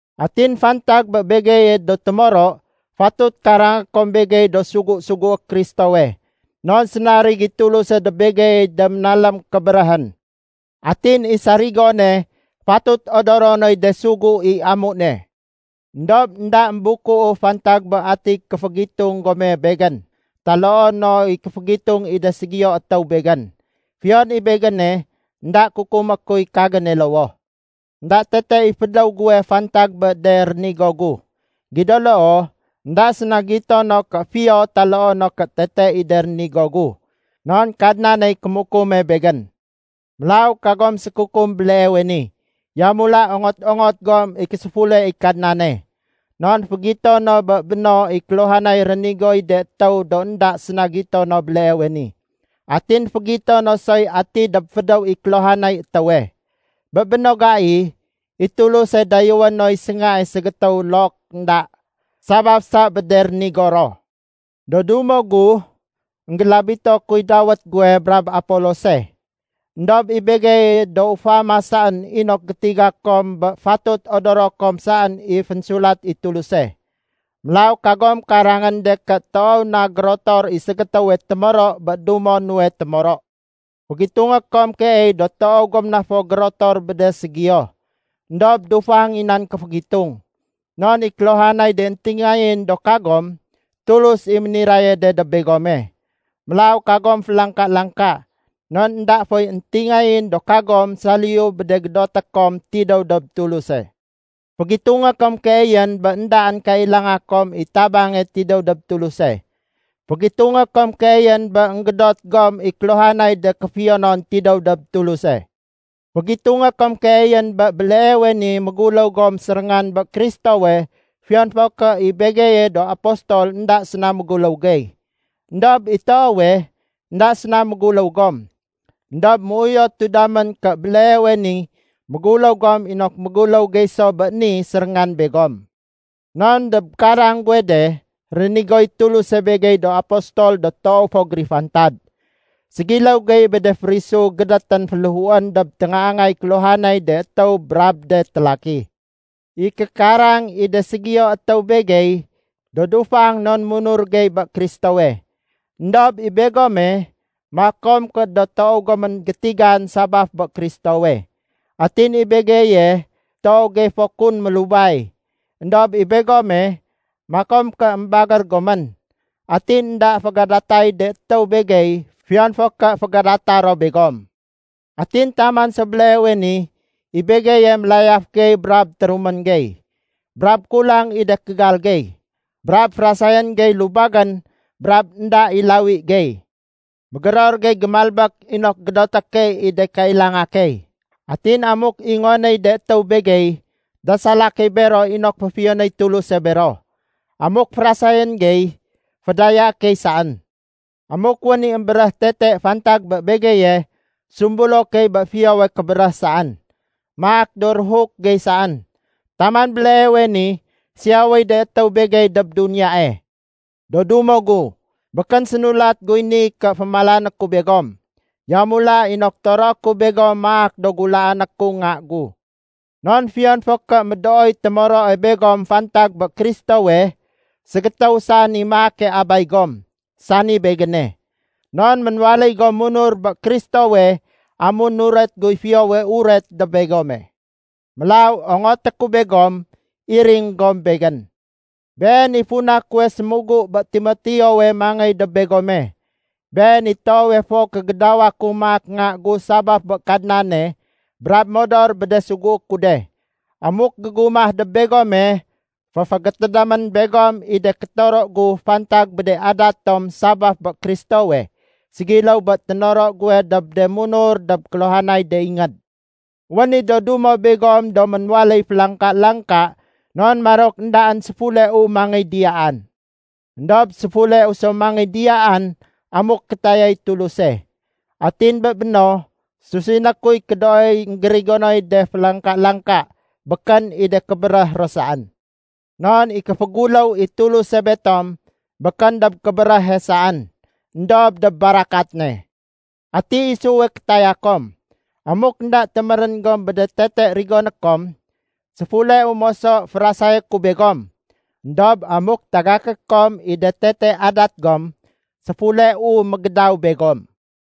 Atin fantag bé begeye do témoro, fatut karangé kom begey do sugu-sugué Kristowe. Non sénarig i Tuluse dob begeyey de ménalém kébéréhén. Atin i sarigone fatut odoro noy de sugu i amu ne. Endob énda émbukuu fantag bé ati kéfégitung gome begén taloo no i kéfégitung i de ségiyo étéw begén. Fiyon i begéne, énda kukumé kuy kagéne lowoh. Enda tete i fédéw guwe fantag bé de rénigo gu. Gido loo, énda séna gito no ké fiyo taloo no ké tete i de rénigo gu, non Kadnaney kémukume begén. Mélaw kagom sékukum béleewe ni. Yamula ongot-ongot gom i késéfule i Kadnane. Non fégito no bé béno i kéluhanay rénigoy de étéw do énda séna gito no béleewe ni. Atin fégito no soy ati dob fédéw i kéluhanay étéwe. Bé béno gai, i Tuluse dayéwé noy séngae ségétéw look énda, sabaf sa bé de rénigo ro. Do dumo gu, énggélabito kuy dawét guwe brab Apolose. Endob i begeye do ufama saén inok gétiga kom bé fatut odoro kom saén i fénsulat i Tuluse. Mélaw kagom karangén de ké toow na gérotor i ségétéwe témoro bé dumo nuwe témoro. Fégitungé kom keey do toow gom na fo gérotor bé de ségiyo. Endob dufang i nan kéfégitung. Non i kéluhanay de éntingayén do kagom, Tulus i méniraye de dob begome. Mélaw kagom félangka-langka, non énda foy éntingayén do kagom saliyu bé de gédoté kom tidéw dob Tuluse. Fégitungé kom keeyén bé éndaén kailanga kom i tabange tidéw dob Tuluse. Fégitungé kom keeyén bé énggédot gom i kéluhanay de kéfiyonon tidéw dob Tuluse. Fégitungé kom keeyén bé béleewe ni méguléw gom séréngan bé Kristowe fiyon fo ké i begeye do apostol énda séna méguléw gey. Endob i toowe, énda séna méguléw gom. Endob méuyotu damén ké béleewe ni méguléw gom inok méguléw gey so béni séréngan begom. Non dob karang guwe de, rénigoy Tuluse begey do apostol do toow fo gérifantad. Ségiléw gey bé de férisu gédétén féléhuén dob téngaangay kéluhanay de étéw brab de télaki. I kékarang i de ségiyo étéw begey, do dufang non munur gey bé Kristowe. Endob i begome, makom ké do toow gomén gétigan sabaf bé Kristowe. Atin i begeye toow gey fo kun mélubay. Endob i begome, makom ké émbagér gomén. Atin énda fégadatay de étéw begey fiyon fo ké fégadata ro begom. Atin taman so béleewe ni i begeye mélayaf gey brab térumén gey, brab kulang i de kégal gey. Brab férasayén gey lubagén brab énda i lawi gey. Mégéror gey gémalbék inok gédoté key i de kailanga key. Atin amuk ingonéy de étéw begey, dasala key bero inok féfiyonéy Tuluse bero. Amuk férasayén gey, fédayaé key saén. Amuk wén i émbéréh tete fantag bé begeye, sumbulo key bé fiyowe kébéréh saén. Maak do ruhuk gey saén. Taman béleewe ni siyawéy de étéw begey dob duniyae. Do dumo gu, békén sénulat guy ni ké fémalané ku begom. Yamula inok toroé ku begom maak do gulaané ku nga gu. Non fiyon fo ké médooy témoroe begom fantag bé Kristowe, ségétéw saén i maake abay gom, sani begéne. Non ménwaléy gom munur bé Kristowe amun nuret guy Fiyowe Uret dob begome. Mélaw ongoté ku begom iring gom begén. Been i funa kuwe sémugu bé Timoteowe mangéy dob begome. Been i toowe fo kégédawa ku maak nga gu sabaf bé Kadnane, brab modor bé de sugué ku de. Amuk gégumah dob begome, féfégétédémén begom i de kétoro gu fantag bé de adat tom sabaf bé Kristowe, ségiléw bé ténoro guwe dob de munur dob kéluhanay de ingéd. Wén i do dumo begom do ménwaléy félangka-langka non marok éndaén séfuleu mangéy diyaan. Endob séfuleu so mangéy diyaan amuk kétayay Tuluse. Atin bé béno, susiné kuy kédooy énggérigonoy de félangka-langka, békén i de kébéréh ro saén. Non i kéféguléw i Tuluse betom békén dob kébéréhe saén, éndob dob barakat ne. Ati isuwe kétaya kom? Amuk énda témérén gom bé de tete rigoné kom, séfuleu moso férasayé ku begom. Endob amuk tagaké kom i de tete adat gom, séfuleu mégédaw begom.